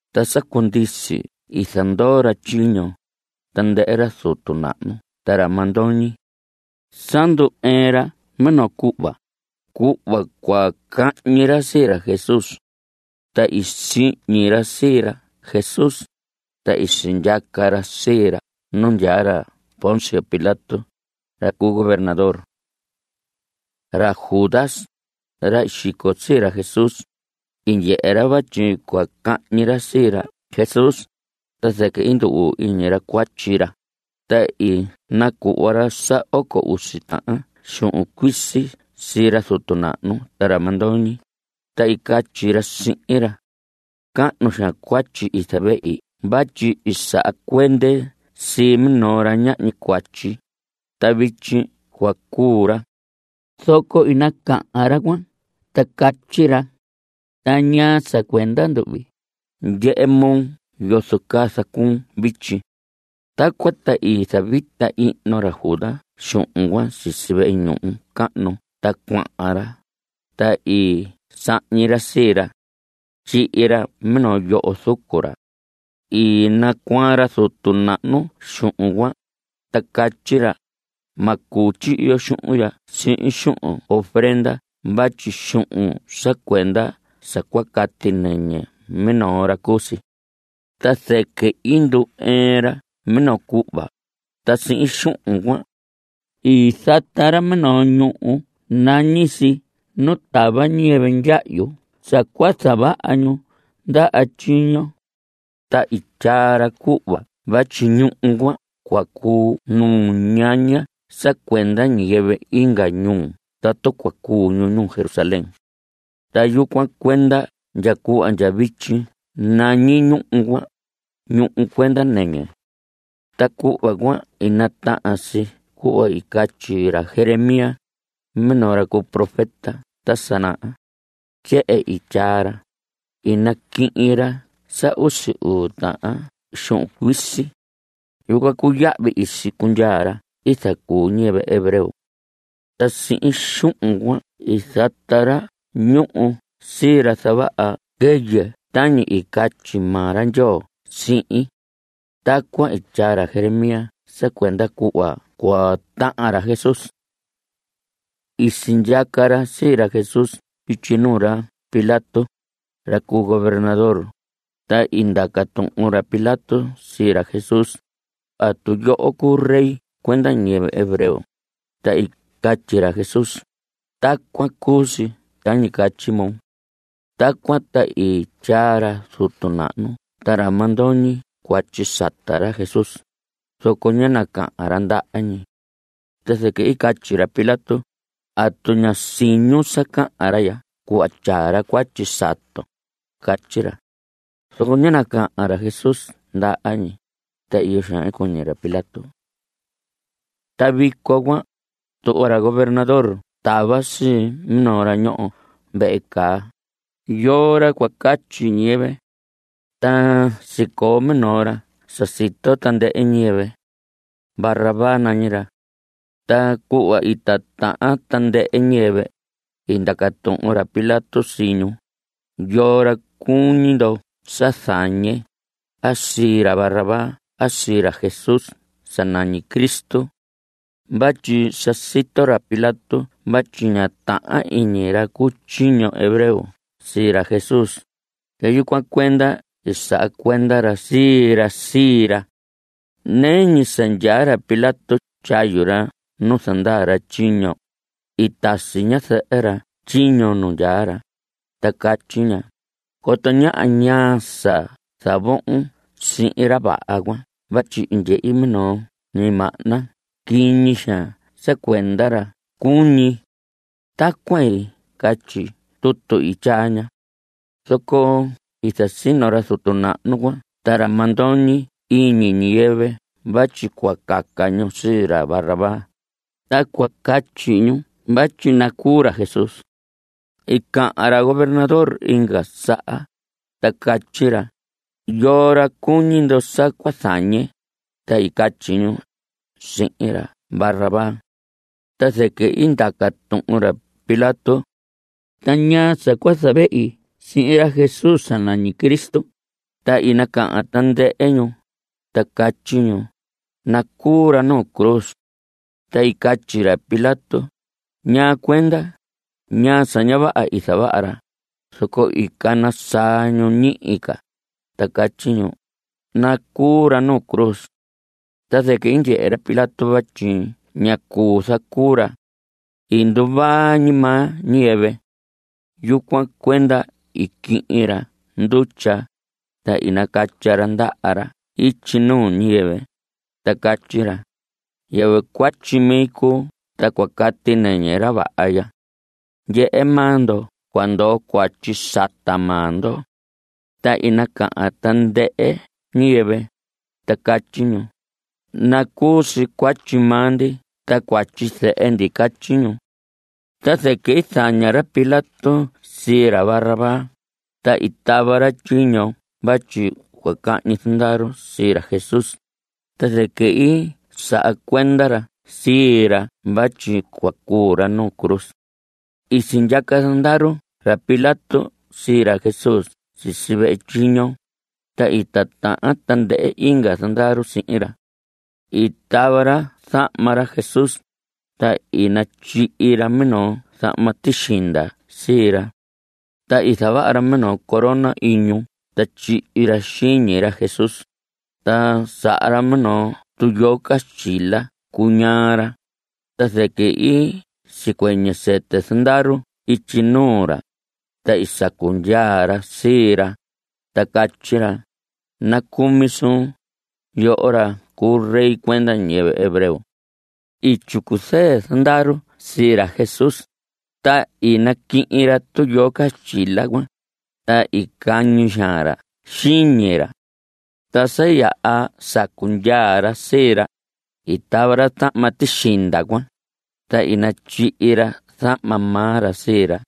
Ta sa cundisi i zandoo ra tyiño, tandɨhɨ ra zutu nahnu ta ra mandoñi. Sa ndu‑ɨɨn ra minoo cuhva, cuhva cua cahñi ra sii ra Jesús. Ta i sihñi ra sii ra Jesús, ta i sindyaca ra sii ra nu ndyaa ra Poncio Pilato, ra cu gobernador. Ra Judas, ra i xico sii ra Jesús, i ndyehe ra vatyi cua cahñi ra sii ra Jesús, ta zɨquɨ i ndu‑uu iñi ra cuatyi ra, ta i nacuhva ra sa oco usi tahan xuhun cuisi sii ra zutu nahnu ta ra mandoñi, ta i catyi ra sihin ra: Cahnu xaan cuatyi i zavehi vatyi i saha cuende sii minoo ra ñahñi cuatyi, ta vityi cua cuu ra. Zoco i nacahan ra cuan, ta catyi ra: ¿Ta ñaa sa cuenda nduhvi? ¡Ndyehe moo yozo caa zacuun vityi! Tacuan ta i zavita ihno ra Judas xuhun cuan sisi vehe ñuhu cahnu ta cuahan ra, ta i sahñi ra sii ra. Tyihi ra minoo yoho zucu ra. I nacuaan ra zutu nahnu xuhun cuan, ta catyi ra: Ma cuu tyihi yo xuhun ya sihin xuhun ofrenda vatyi xuhun sa cuenda sa cua cati nɨñɨ minoo ra cu si. Ta zɨquɨ i ndu‑ɨɨn ra minoo cuhva, ta sihin xuhun cuan, i zata ra minoo ñuhu nañi si Nu Tava Ñiyɨvɨ Ndyahyu sa cua Zavaha Ñu Ndaha Tyiño. Ta tyaa ra cuhva vatyi ñuhu cuan cua cuu nuñaña sa cuenda ñiyɨvɨ inga ñuu tatu cua cuu ñu ñuu Jerusalén. Ta yucuan cuenda ndya cuhva ndya vityi nañi ñuhu cuan, Ñuhu Cuenda Nɨñɨ. Ta cuhva cuan i natahan si cuhva i catyi ra Jeremías, minoo ra cu profeta ta sa naha. Tyehen i tyaa ra: “I naquihin ra sa usi uu tahan xuhun cuisi. Yucuan cuu yahvi i sicundyaa ra i zacuu ñiyɨvɨ hebreo. Ta sihin xuhun cuan i zata ra ñuhu sii ra zavaha quɨyɨ tañi i catyi maa ra Ndyoo sihin.” Tacuan i tyaa ra Jeremías sa cuenda cuhva cua tahan ra Jesús. I sindyaca ra sii ra Jesús ityi nuu ra Pilato, ra cu gobernador, ta i ndaca tuhun ra Pilato sii ra Jesús: ¿Atu yoho cuu rey cuenda ñiyɨvɨ hebreo? Ta i catyi ra Jesús: Tacuan cu si tañi catyi moo. Tacuan ta i tyaa ra zutu nahnu ta ra mandoñi cuatyi sata ra Jesús, zoco ñá nacahan ra ndaha ñi. Ta zɨquɨ i catyi ra Pilato: ¿Atu ña siñun sa cahan ra ya, cuhva tyaa ra cuatyi saton? Catyi ra. Zoco ñá nacahan ra Jesús ndaha ñi, ta iyo xaan i cuñi ra Pilato. Ta vico cuan, tuhva ra gobernador tava sii minoo ra ñoho vehe caa, yoo ra cua catyi ñiyɨvɨ. Ta sicoo minoo ra sa sito tandɨhɨ ñiyɨvɨ. Barrabás nañi ra. Ta cuhva i titahan tandɨhɨ ñiyɨvɨ, i ndaca tuhun ra Pilato sii ñu: ¿Yoo ra cuñi ndo sa zañe, a sii ra Barrabás a sii ra Jesús sa nañi Cristo? Vatyi sa sito ra Pilato vatyi ña tahan iñi ra cu tyiño hebreo sii ra Jesús, ta yucuan cuenda i saha cuenda ra sii ra sii ra. Nɨɨ ñi sa ndyaa ra Pilato tyayu ra nu zandaa ra tyiño, i tasi ñazɨhɨ ra tyiño nu ndyaa ra, ta catyi ña: “Coto ñaha ñaa sa zavohon sihin ra vaha cuan vatyi i ndyehi minoo ñimahna quiñi xaan sa cuenda ra cuñi.” Tacuan catyi tutu i tyaa ña. Zoco i zasino ra zutu nahnu cuan ta ra mandoñi iñi ñiyɨvɨ vatyi cua caca ñu sii ra Barrabás, ta cua catyi ñu vatyi nacuu ra Jesús. I cahan ra gobernador inga saha, ta catyi ra: ¿Yoo ra cuñi ndo sa cua zañe? Ta i catyi ñu: Sii ra Barrabás. Ta zɨquɨ i ndaca tuhun ra Pilato: Ta ¿ñaa sa cua zavehi sihin ra Jesús sa nañi Cristo? Ta i nacahan tandɨhɨ ñu, ta catyi ñu: ¡Nacuu ra nu cruz! Ta i catyi ra Pilato: ¿Ñaa cuenda? ¿Ñaa sa ña vaha i zavaha ra? Zoco i cana saa ñu ñihi ca, ta catyi ñu: ¡Nacuu ra nu cruz! Ta zɨquɨ i ndyehe ra Pilato vatyi ñá cuu zacuu ra. I nduvaa ñi maa ñiyɨvɨ. Yucuan cuenda i quihin ra ndutya, ta i nacatya ra ndaha ra ityi nuu ñiyɨvɨ, ta catyi ra: Yɨvɨ cuatyi mi cuu ta cua cati nɨñɨ ra vaha ya. Ndyehe maa ndo cua ndoo cuatyi sata maa ndo. Ta i nacahan tandɨhɨ ñiyɨvɨ, ta catyi ñu: Nacuu si cuatyi maa ndi ta cuatyi zehe ndi. Catyi ñu. Ta zɨquɨ i zaña ra Pilato sii ra Barrabás, ta i tava ra tyiño vatyi cua cañi zandaru sii ra Jesús, ta zɨquɨ i saha cuenda ra sii ra vatyi cua cuu ra nu cruz. I sindyaca zandaru ra Pilato sii ra Jesús sisi vehe tyiño, ta i titahan tandɨhɨ inga zandaru sihin ra. I tava ra zahma ra Jesús, ta i natyihi ra minoo zahma tixinda sii ra. Ta i zavaha ra minoo corona iñu ta tyihi ra xiñi ra Jesús, ta saha ra minoo tuyoo caxtyila cuñaa ra, ta zɨquɨ i sicuɨñɨ sɨtɨ zandaru ityi nuu ra, ta i sacu ndyaa ra sii ra, ta catyi ra: Nacumi suun, yoho ra cu rey cuenda ñiyɨvɨ hebreo. I tyicu zɨɨ zandaru sii ra Jesús, ta i naquihin ra tuyoo caxtyila cuan, ta i cañi xaan ra xiñi ra. Ta sa yaha sacu ndyaa ra sii ra, i tava ra zahma tixinda cuan, ta i natyihi ra zahma maa ra sii ra.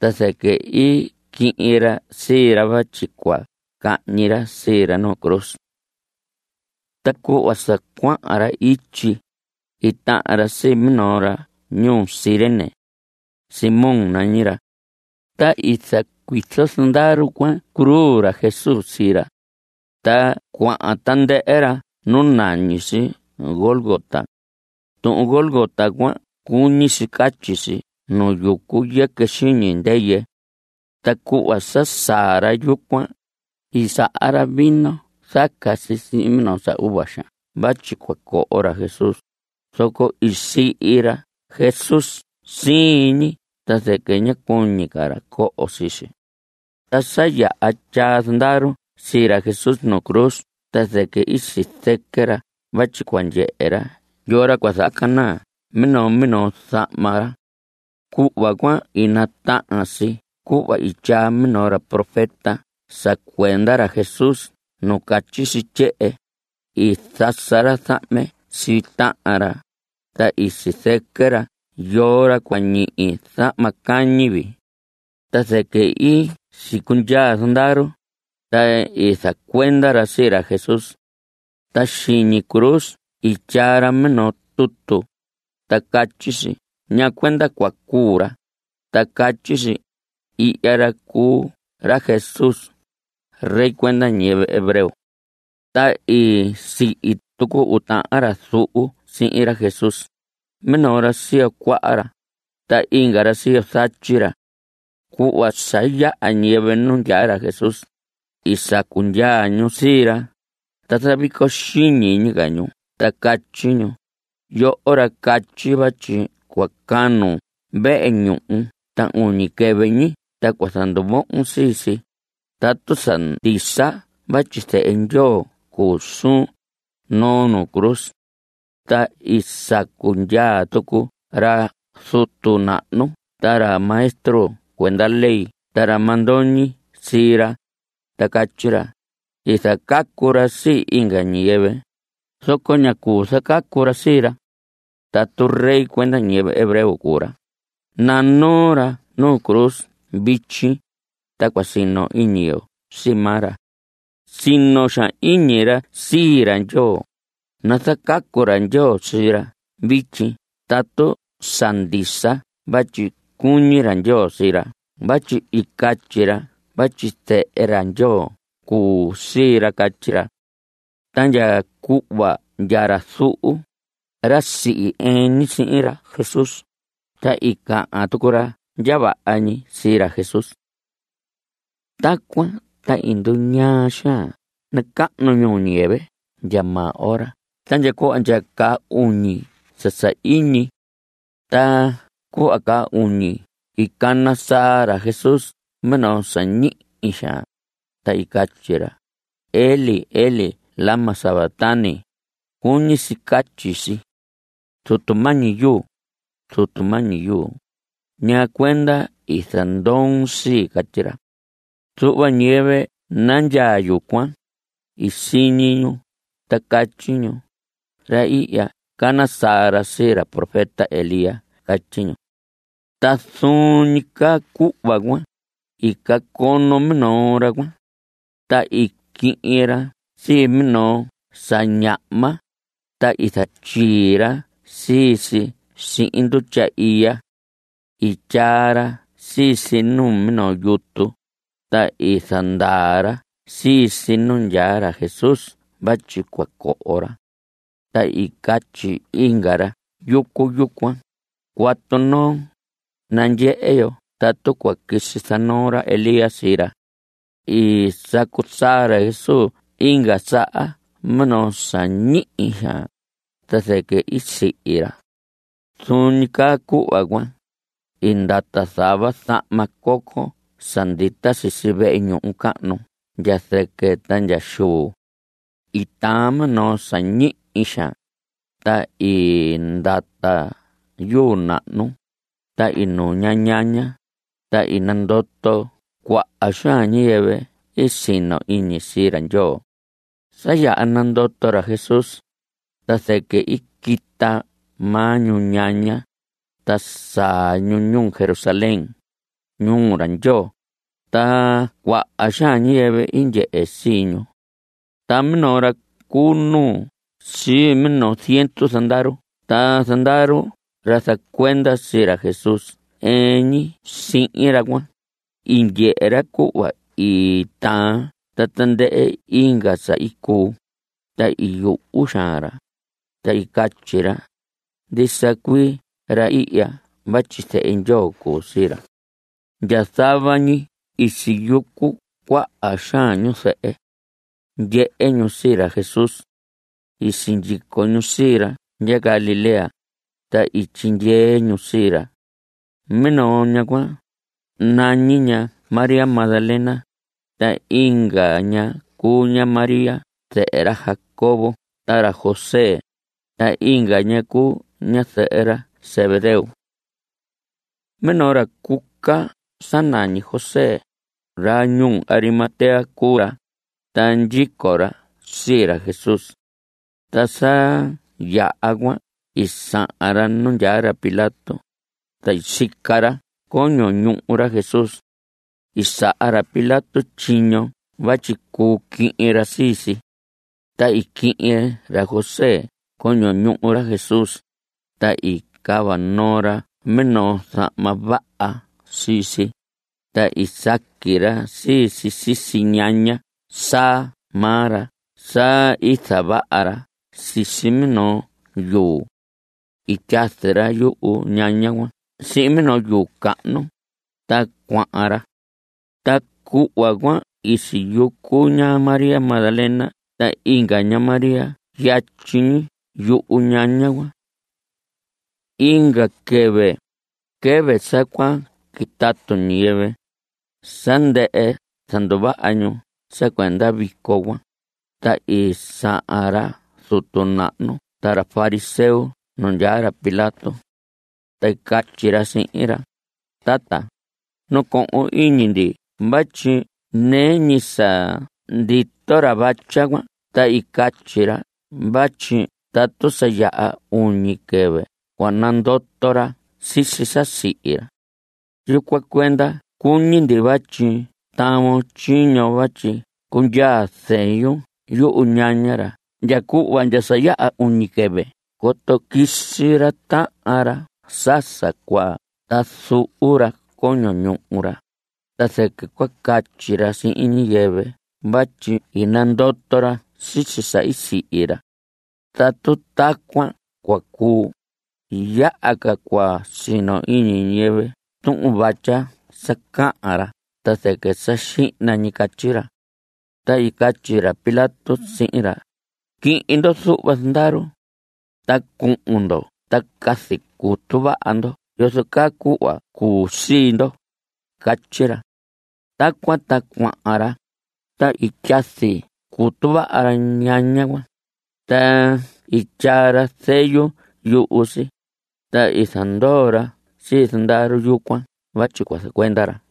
Ta zɨquɨ i quihin ra sii ra vatyi cua cahñi ra sii ra nu cruz. Ta cuhva sa cuahan ra ityi, i tahan ra sii minoo ra ñuu Cirene. Simón nañi ra. Ta i zacuizo zandaru cuan cruz ra Jesús sii ra. Ta cuahan tandɨhɨ ra nu nañi si Gólgota. Tuhun Gólgota cuan cuñi si catyi si Nu Yucu Yɨquɨ Xiñi Ndɨyɨ. Ta cuhva sa saa ra yucuan, i saha ra vino zaca si sihin minoo sa uva xaan vatyi cua coho ra Jesús, zoco i sihi ra Jesús siin ñi ta zɨquɨ ñá cuñi ca ra coho sii si. Ta sa yaha tyaa zandaru sii ra Jesús nu cruz ta zɨquɨ i sizɨquɨ ra vatyi cua ndyehe ra yoo ra cua zahacanaa minoo minoo zahma ra. Cuhva cuan i natahan si cuhva i tyaa minoo ra profeta sa cuenda ra Jesús nu catyi si tyehen: “I zasa ra zahme sii tahan ra, ta i sizɨquɨ ra yoo ra cua ñihi zahma cañi vii.” Ta zɨquɨ i sicundyaa zandaru, ta i zacuenda ra sii ra Jesús. Ta xiñi cruz i tyaa ra minoo tutu, ta catyi si ñaa cuenda cua cuu ra, ta catyi si: “Ihya ra cuu ra Jesús, rey cuenda ñiyɨvɨ hebreo.” Ta i sihi tucu uu tahan ra zuhu sihin ra Jesús, minoo ra siyo cuaha ra, ta inga ra siyo zatyi ra. Cuhva sa yaha ñiyɨvɨ nu ndyaa ra Jesús, i sacu ndyaa ñu sii ra, ta zavico xiñi ñi ca ñu ta catyi ñu: Yoho, ra catyi vatyi cua canun vehe ñuhu ta uñi quɨvɨ ñi ta cua zanduvohon sii si, tatu sa ndisa vatyi zehe ra Ndyoo cuu suun, noon nu cruz. Ta i sacu ndyaa tucu ra zutu nahnu ta ra maestro cuenda ley ta ra mandoñi sii ra, ta catyi ra: I zacacu ra sii inga ñiyɨvɨ, zoco ña cuu zacacu ra sii ra. Tatu rey cuenda ñiyɨvɨ hebreo cuu ra, nanoo ra nu cruz vityi, ta cua sino iñi yo sii maa ra. Sino xaan iñi ra sii ra Ndyoo, nazacacu ra Ndyoo sii ra vityi tatu sa ndisa vatyi cuñi ra Ndyoo sii ra vatyi i catyi ra vatyi Zehe ra Ndyoo cuu sii ra. Catyi ra. Ta ndya cuhva ndya ra zuhu, ra sihi ɨɨn ñi sihin ra Jesús, ta i cahan tucu ra ndya vaha ñi sii ra Jesús. Tacuan ta i nduñaa xaan nacahnu ñuu ñiyɨvɨ ndya maa ora ta ndya cuhva ndya caa uñi sa sahiñi. Ta cuhva caa uñi i cana saa ra Jesús minoo sa ñihi xaan, ta i catyi ra: Elí, Elí ¿lama sabactani? Cuñi si catyi si: Zutu mañi yu, Zutu mañi yu, ¿ñaa cuenda i zandoon sii? Catyi ra. Zuhva ñiyɨvɨ nandyaa yucuan, i siñi ñu ta catyi ñu: Ra ihya cana saa ra sii ra profeta Elías. Catyi ñu. Ta zuun ñi caa cuhva cuan, i cacono minoo ra cuan, ta i quihin ra sii minoo sa ñahma, ta i zatyii ra sii si sihin ndutya iya. I tyaa ra sii si numinoo yutu, ta i zandaa ra sii si nu ndyaa ra Jesús vatyi cua coho ra. Ta i catyi inga ra yucu yucuan: Cuatu noo, nandyehe yo tatu cua quisi zanoo ra Elías sii ra. I sacu saa ra Jesús inga saha minoo sa ñihi xaan, ta zɨquɨ i sihi ra. Zuun ñi caa cuhva cuan, i ndata zava zama coco sa ndita sisi vehe ñuhu cahnu ndya zɨquɨ ta ndya xuu. I taan minoo sa ñihi xaan, ta i ndata yuu nahnu, ta i nuña ñaña, ta i nandoto cuaha xaan ñiyɨvɨ i sino iñi sii ra Ndyoo. Sa yaha nandoto ra Jesús, ta zɨquɨ i quita maa ñu ñaña, ta saa ñu ñuu Jerusalén, ñuu ra Ndyoo, ta cuaha xaan ñiyɨvɨ i ndyehe sii ñu. Ta minoo ra cu nuu sii minoo ziendu zandaru ta zandaru ra zacuenda sii ra Jesús ɨɨn ñi sihin ra cuan, i ndyehe ra cuhva i taan ta tandɨhɨ inga sa i cuu, ta i yuhu xaan ra, ta i catyi ra: Ndisa cuii ra ihya vatyi zehe Ndyoo cu sii ra. Ndya zava ñi i siyucu cuaha xaan ñu zɨhɨ. Ndyehe ñu sii ra Jesús. I sindyico ñu sii ra ndya Galilea, ta i tyindyee ñu sii ra. Minoo ña cuan, nañi ña María Magdalena, ta inga ña cuu ña María zɨhɨ ra Jacobo ta ra José, ta inga ña cuu ñazɨhɨ ra Zebedeo. Minoo ra cuca sa nañi José, ra ñuu Arimatea cuu ra, ta ndyico ra sii ra Jesús. Ta sa tyahan cuan i sahan ra nu ndyaa ra Pilato, ta i sica ra coño ñuhu ra Jesús. I saha ra Pilato tyiño vatyi cuu quihin ra sii si. Ta i quihin ra José coño ñuhu ra Jesús, ta i cava noo ra minoo zahma vaha sii si, ta i saqui ra sii si sisi ñaña saa maa ra sa i zavaha ra sisi minoo yuu. I tyazi ra yuhu ñaña cuan sihin minoo yuu cahnu, ta cuahan ra. Ta cuhva cuan i siyucu ña María Magdalena ta inga ña María yatyi ñi yuñaña cuan. Inga quɨvɨ, quɨvɨ sa cua quitatu ñiyɨvɨ, sa ndɨhɨ zanduvaha ñu sa cuenda vico cuan, ta i sahan ra zutu nahnu ta ra fariseo nu ndyaa ra Pilato. Ta i catyi ra sihin ra: Tata, nacohon iñi ndi vatyi nɨɨ ñi sa ndito ra vatya cuan ta i catyi ra vatyi tatu sa yaha uñi quɨvɨ cua nandoto ra sisi sa i sihi ra. Yucuan cuenda cuñi ndi vatyi tavon tyiño vatyi cundyaa zeyun yuhu ñaña ra ndya cuhva ndya sa yaha uñi quɨvɨ coto quisi ra tahan ra sa sa cuaa ta zuhu ra coño ñuhu ra, ta zɨquɨ cua catyi ra sihin ñiyɨvɨ vatyi i nandoto ra sisi sa i sihi ra. Tatu tacuan cua cuu, yaha ca cua sino iñi ñiyɨvɨ tuhun vatya sa cahan ra ta zɨquɨ sa xihna ñi. Catyi ra. Ta i catyi ra Pilato sihin ra: Quihin ndo zuhva zandaru. Ta cuhun ndo ta cazi cutu vaha ndo yozo ca cuhva cuu sii ndo. Catyi ra. Tacuan ta cuahan ra, ta i tyazi cutu vaha ra ñaña cuan, ta i tyaa ra zeyu yuhu si, ta i zandoo ra sii zandaru yucuan vatyi cua zacuenda ra.